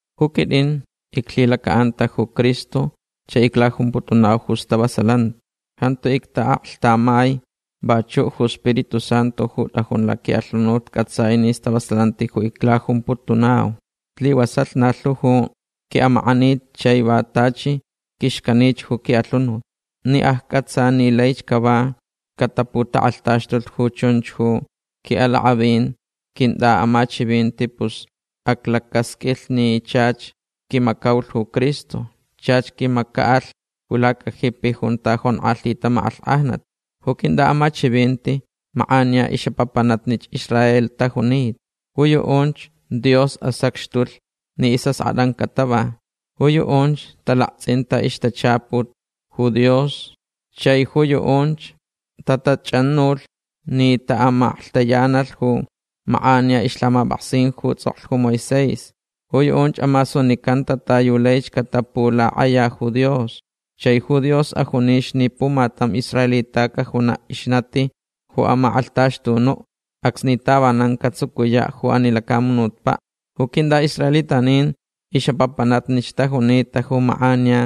Ju quitʼin iclhilacaʼanta ju Cristo chai iclajumputunau ju stavasalanti. Jantu ictaʼaklhtamai. Vachuʼ ju Spiritu Santu ju tʼajun laquiʼalhunut cʼatsai ni stavasalanti ju iclajumputunau. Slivasalh na lhu ju quiʼamakʼanit chai va tachi quixcanich ju quiʼalhunut. Ni accʼatsa ni laich cava cataputakʼalhtaxtulh ju chunch ju quiʼalakʼavin quintʼaʼamachivinti pus aclacasqʼuilhch ni chach quimacaulh ju Cristo. Chach quimacaʼalh ju lacajipi junta jonkʼalhita makʼalhkʼajnat. Ju quintʼaʼamachivinti makʼaniya ixʼapapanatnich Israel tajunita. Ju yuʼunch Dios asacxtulh ni isʼaskʼatʼan catava. Ju yuʼunch talaktsʼinta ixtachaput ju Dios. Chai ju yuʼunch tatachʼanulh ni taʼamaklhtayanalh ju makʼaniya ixlhamapʼaksin ju tsʼoklh ju Moisés. Ju yuʼunch amasunicanta ta yu laich catapulakʼaya ju Dios. Chai ju Dios ajunich ni pumatam israelita cajunaʼ ixnati ju amakʼalhtaxtunuʼ acsni tavanan catsucuyaʼ ju ani lacamunutpaʼ. Ju quintʼaʼisraelitanin ixʼapapanatnich tajunita ju makʼaniya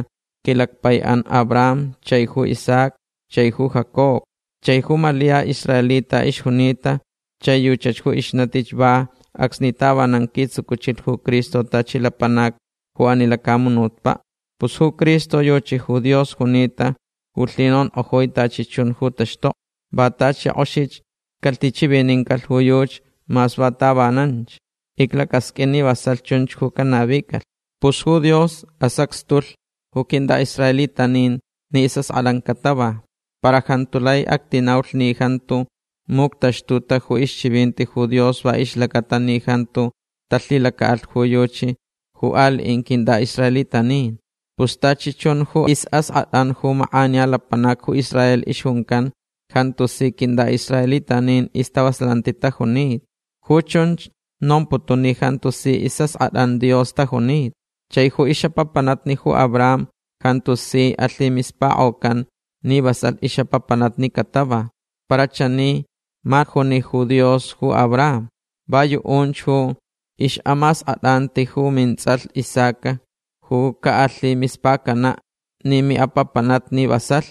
quilacpaiʼan Abraham chai ju Isaac chai ju Jacob. Chai ju Malia israelita ixjunita chai yuchach ju ixnatich va acsni tavanan quitsucuchilh ju Cristo tachi lapanac ju ani lacamunutpaʼ. Pus ju Cristo yuchi ju Dios junita ju lhinonkʼojui tachi chun ju taxtokni. Va tachi kʼoxich calhichivinincalh ju yuchi mas va tavananch. Iclacasqʼuin ni vasalh chunch ju canavicalh. Pus ju Dios asacxtulh ju quintʼaʼisraelitanin ni isʼaskʼatʼan catava. Para jantu lai actinaulh ni jantu muctaxtuta ju ixchivinti ju Dios va ixlacaʼatalh ni jantu talhilacaʼalh ju yuchi ju aliʼin quintʼaʼisraelitanin. Pus tachi chun ju isʼaskʼatʼan ju makʼaniya lapanac ju Israel ixjuncan jantu si quintʼaʼisraelitanin istavasalanti tajunita. Ju chunch nomputun ni jantu si isʼaskʼatʼan Dios tajunita. Chai ju ixʼapapanatnich ju Abraham jantu si alhimispakʼocan ni vasalh ixʼapapanatnich catava. Para chani ma juni ju Dios ju Abraham: “Va yuʼunch ju ixʼamaskʼatʼanti ju mintsʼalh Isaac ju caʼalhimispacanach ni miʼapapanatnich vasalh”.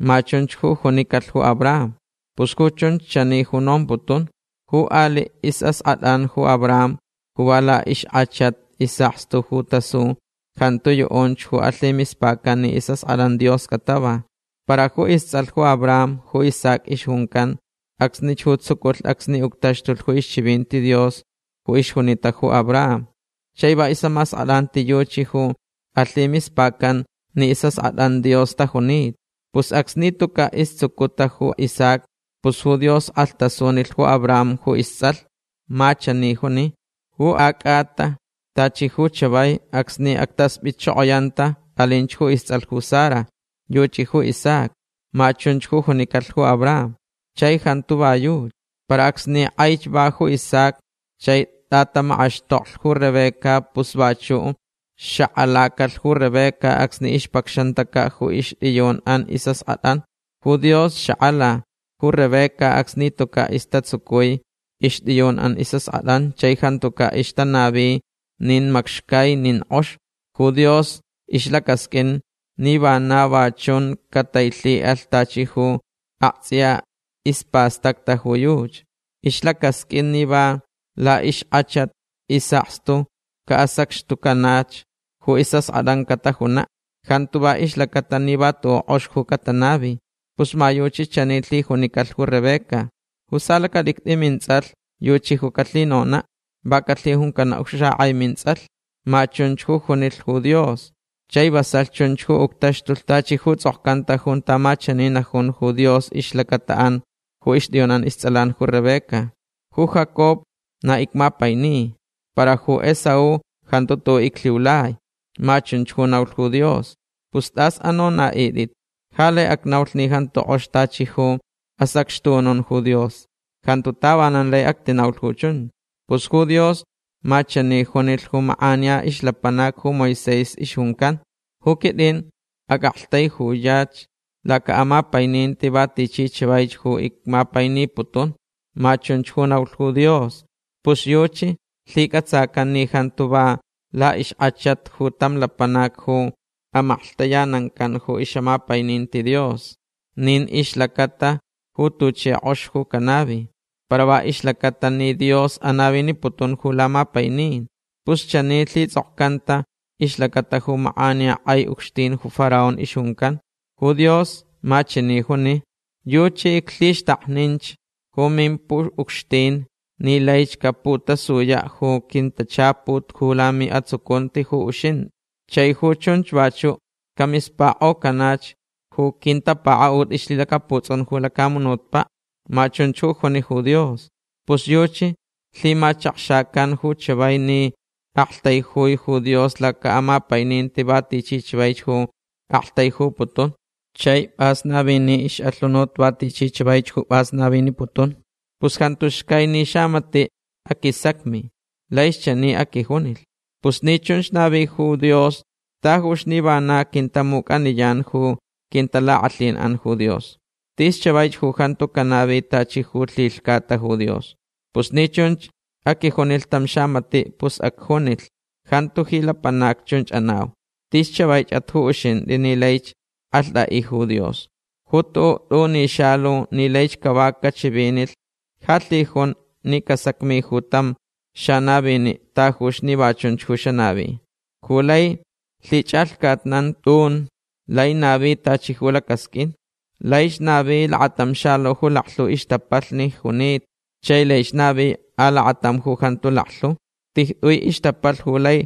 Ma chunch ju junicalh ju Abraham. Pus ju chunch chani ju nomputun. Ju aliʼ isʼaskʼatʼan ju Abraham ju va laʼixkʼachat isʼakstu ju tasu jantu yuʼunch ju alhimispacan ni isʼaskʼatʼan Dios catava. Para ju istsʼalh ju Abraham ju Isaac ixjuncan acsnich ju tsuculh acsni uctaxtulh ju ixchivinti Dios ju ixjunita ju Abraham. Chai va ixʼamaskʼatʼanti yuchi ju alhimispacanch ni isʼaskʼatʼanch Dios tajunita. Pus acsni tucaʼ istsucuta ju Isaac pus ju Dios kʼalhtasunilh ju Abraham ju istsʼalh. Ma chani ju juni: “Ju acʼata tachi ju chavai acsni actaspʼitchokoyanta alinch ju istsʼalh ju Sara. Yuchi ju Isaac”. Ma chunch ju junicalh ju Abraham. Chai jantu va yuchi. Para acsni kʼaich va ju Isaac chai tʼatamakʼaxtoklh ju Rebeca pus vachuʼ xakʼalacalh ju Rebeca acsni ixpacxantacaʼ ju ixtʼiyunʼan isʼaskʼatʼan. Ju Dios xakʼalalh ju Rebeca acsni tucaʼ istatsucui ixtʼiyunʼan isʼaskʼatʼan chai jantucaʼ ixtanavita nin macxcai nin kʼox. Ju Dios ixlacasqʼuin ni vana va chunch catailhiʼalh tachi ju aktsʼiya ispastacta ju yuchi. Ixlacasqʼuin ni va laʼixkʼachat isʼakstu caʼasacxtucanach ju isʼaskʼatʼan catajunaʼ. Jantu va ixlacata ni va tuʼuʼ kʼox ju catanavi. Pus ma yuchi chani lhijunicalh ju Rebeca: “Ju salacatʼicstʼi mintsʼalh yuchi ju calhinonaʼ. Va calhijuncanaʼ ju xakʼai mintsʼalh”. Ma chunch ju junilh ju Dios. Chai vasalh chunch ju uctaxtulh tachi ju tsʼokcanta junta ma chani najun ju Dios ixlacataʼan ju ixtʼiyunʼan istsʼalan ju Rebeca: “Ju Jacob na icmapaini. Para ju Esaú jantu tuʼuʼ iclhiulai”. Ma chunch ju naulh ju Dios. Pus tas anonaʼitʼit. Ja lai acnaulh ni jantu kʼox tachi ju asacxtunun ju Dios. Jantu tavanan lai actinaulh ju chunch. Pus ju Dios ma chani junilh ju makʼaniya ixlapanac ju Moisés ixjuncan: “Ju quitʼin acʼaktaijuyach lacaʼamapaininti va tichi chavaich ju icmapainiputunch”. Ma chunch ju naulh ju Dios. Pus yuchi lhicʼatsacanch ni jantu va laʼixkʼachat ju tam lapanac ju amaklhtayanancan ju ixʼamapaininti Dios. Nin ixlacaʼatalh ju tuchi kʼox ju canavi. Para va ixlacaʼatalh ni Dios anaviniputun ju lamapainin. Pus chanich lhitsʼokcanta ixlacata ju makʼaniya kʼai ucxtin ju Faraón ixjuncan. Ju Dios ma chani juni: “Yuchi iclhixtakninch ju mimpuʼucxtin ni laich caputasuyaʼ ju quintachaput ju lamiʼatsucunti ju uxintʼi. Chai ju chunch vachuʼ camispakʼocanach ju quintapakaʼut ixlhilacaputsʼun ju lacamunutpaʼ”. Ma chunch ju juni ju Dios. Pus yuchi lhimachakxacan ju chavai ni aktaijui ju Dios lacaʼamapaininti va tichi chavaich ju aktaijuputunch. Chai pʼas navini ixʼalhunut va tichi chavaich ju pʼas naviniputunch. Pus jantu xcai ni xamatiʼ aquisacmilh. Laich chani aquijunilh: “Pus ni chunch navi ju Dios tajuch ni vana quintamucʼaniyan ju quintalakʼalhinʼan ju Dios. Tis chavaich ju jantu canavi tachi ju lhilhcata ju Dios”. Pus ni chunch aquijunilh tam xamatiʼ pus acjunilh: “Jantu ji lapanac chunch anau. Tis chavaichʼat ju uxintʼi ni laich kʼalhtʼaʼi ju Dios. Ju tuʼuʼ tʼuni xalu ni laich cava cachivinilh ja lhijun ni casacmi ju tam xanaviniʼ tajuch ni va chunch ju xanavi”. Ju lai lhichʼalhcatnan tʼun lai navi tachi ju lacasqʼuin. Laich navi lakatam xalu ju laklhu ixtapalh junita. Chai laich navi alakatam ju jantu laklhu. Tijtʼui ixtapalh ju lai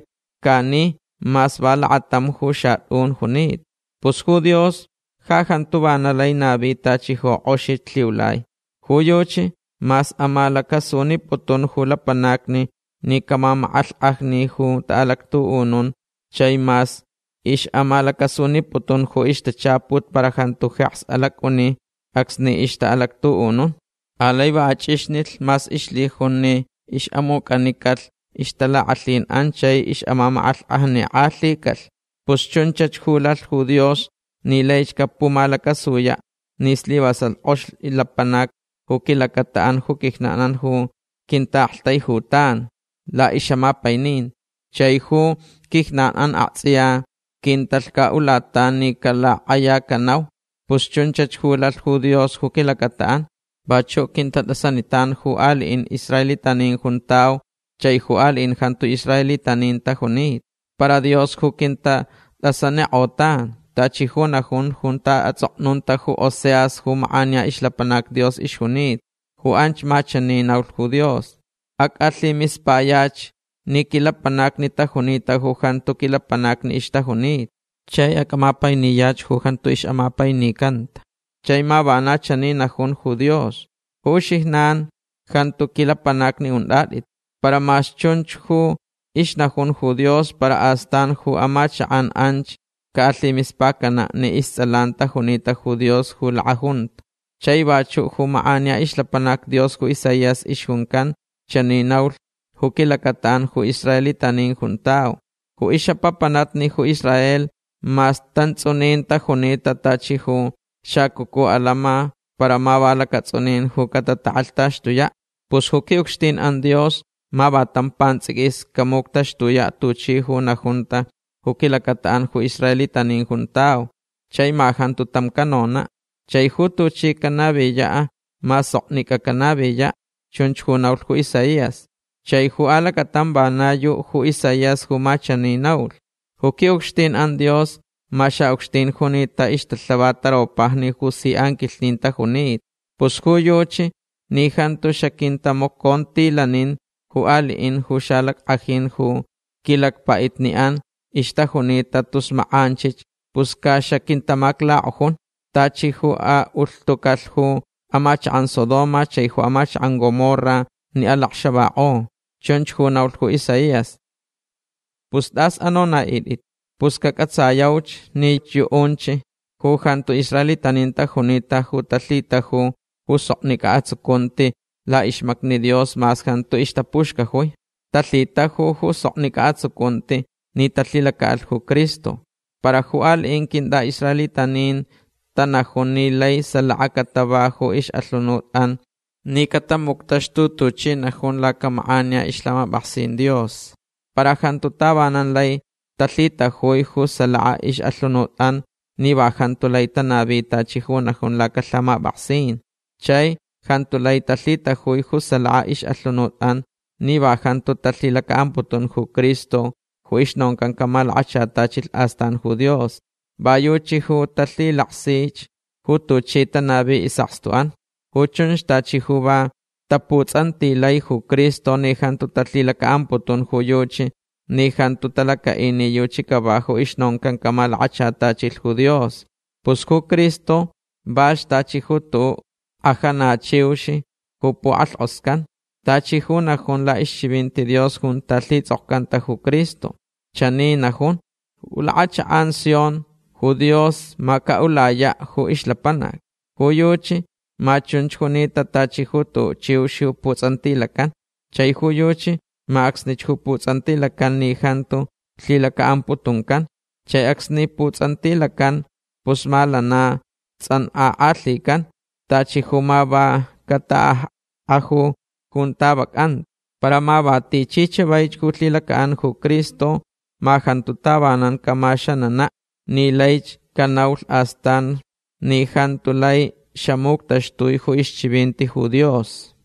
lhcani mas va lakatamch ju xatʼun junita. Pus ju Dios ja jantu vana lai navi tachi ju kʼoxich lhiulai. Ju yuchi mas amalacasuniputun ju lapanacni ni camamakʼalhkʼajni ju taʼalactuʼunun chai mas ixʼamalacasuniputun ju ixtachaput para jantu jeks alacʼuni acsni ixtaʼalactuʼunun. Alai va achʼixnilh mas ixlhijun ni ixʼamucʼanicalh ixtalakʼalhinʼan chai ixʼamamakʼalhkʼajnikʼalhicalh. Pus chunchach ju lalh ju Dios ni laich capumalacasuyaʼ ni slivasalh kʼox lapanac ju quilacataʼan ju quijnanʼan ju quintaʼaktaijutan laʼixʼamapaininti. Chai ju quijnanʼan aktsʼiya quintalhcaʼulatan ni calakʼayacanau. Pus chunchach ju lalh ju Dios ju quilacataʼan. Vachuʼ quintatʼasanitan. Ju aliʼin israelitanin juntau chai ju aliʼin jantu israelitanin tajunita. Para Dios ju quintatʼasanikʼotan. Tachi ju najun junta atsʼoknunta ju Oseas ju makʼaniya ixlapanac Dios ixjunita. Ju anch ma chani naulh ju Dios: Acʼalhimispayach ni quilapanacni tajunita ju jantu quilapanacni ixtajunita. Chai acʼamapainiyach ju jantu ixʼamapainicanta. Chai ma vana chani najun ju Dios: “Ju uxijnan jantu quilapanacni untʼatʼit”. Para mas chunch ju ixnajun ju Dios para astan ju amachakʼan anch caʼalhimispacanaʼ ni istsʼalan tajunita ju Dios ju lakʼajunta. Chai vachuʼ ju makʼaniya ixlapanac Dios ju Isaías ixjuncan chani naulh ju quilacataʼan ju israelitanin juntau: “Ju ixʼapapanatnich ju Israel mas tantsʼunin tajunita tachi ju xacucu alama para ma va lacatsʼunin ju catatakʼalhtaxtuyaʼ. Pus ju quiʼucxtinʼan Dios ma va tam pantsʼiquis camuctaxtuyaʼ tuchi ju najunta ju quilacataʼan ju israelitanin juntau. Chai ma jantu tam canonaʼ. Chai ju tuchi canaviyaʼ ma soknicʼa canaviyaʼ”. Chunch ju naulh ju Isaías. Chai ju alacatam vana yuʼ ju Isaías ju ma chani naulh: Ju quiʼucxtinʼan Dios ma xaʼucxtin junita ixtalhavat taropajni ju si anquilhnin tajunita. Pus ju yuchi ni jantu xaquintamacontilanin ju aliʼin ju xalackʼajin ju quilacpaʼitniʼan ixtajunita tus makʼanchich pus ca xaquintamaclakʼojun tachi ju aʼulhtucalh ju amachakʼan Sodoma chai ju amachakʼan Gomorra ni alacxavakʼo. Chunch ju naulh ju Isaías. Pus tas anonaʼitʼit. Pus cacʼatsayauch ni yuʼunch ju jantu israelitanin tajunita ju talhitajulh ju soknicʼa atsucunti laʼixmacni Dios mas jantu ixtapuxcajui. Talhitajulh ju soknicʼa atsucunti ni talhilacaʼalh ju Cristo. Para ju aliʼin quintʼaʼisraelitanin tanajun ni laich salaka catava ju ixʼalhunutʼan ni catamuctaxtulh tuchi najun lacamakʼaniya ixlhamapʼaksin Dios. Para jantu tavanan lai talhitajui ju salaka ixʼalhunutʼan ni va jantu lai tanavi tachi ju najun lacalhamapʼaksin. Chai jantu lai talhitajui ju salaka ixʼalhunutʼan ni va jantu talhilacaʼamputun ju Cristo ju ixnoncan camalakachatachilh astan ju Dios. Va yuchi ju talhilaksich ju tuchi tanavi isʼakstuʼan. Ju chunch tachi ju va taputsʼantilai ju Cristo ni jantu talhilacaʼamputun ju yuchi ni jantu talacaʼi ni yuchi cava ju ixnoncan camalakachatachilh ju Dios. Pus ju Cristo valhch tachi ju tuʼuʼ lhkajanichiux ju pukʼalhkʼoscan. Tachi ju najun laʼixchivinti Dios junta lhitsʼokcanta ju Cristo. Chani najun: Ju lakʼachakʼan Sion ju Dios ma caʼulayaʼ ju ixlapanac. Ju yuchi ma chunch junita tachi ju tuʼuʼ chiux ju putsʼantilacan. Chai ju yuchi ma acsnich ju putsʼantilacan ni jantu lhilacaʼamputuncan. Chai acsni putsʼantilacan pus ma lana tsʼankʼakʼalhican. Tachi ju ma va cataʼakkʼaju junta vacʼanta. Para ma va tichi chavaich ju lhilacaʼan ju Cristo ma jantu tavanan camaxananaʼ ni laich canaulh astan ni jantu lai xamuctaxtuni ju ixchivinti ju Dios.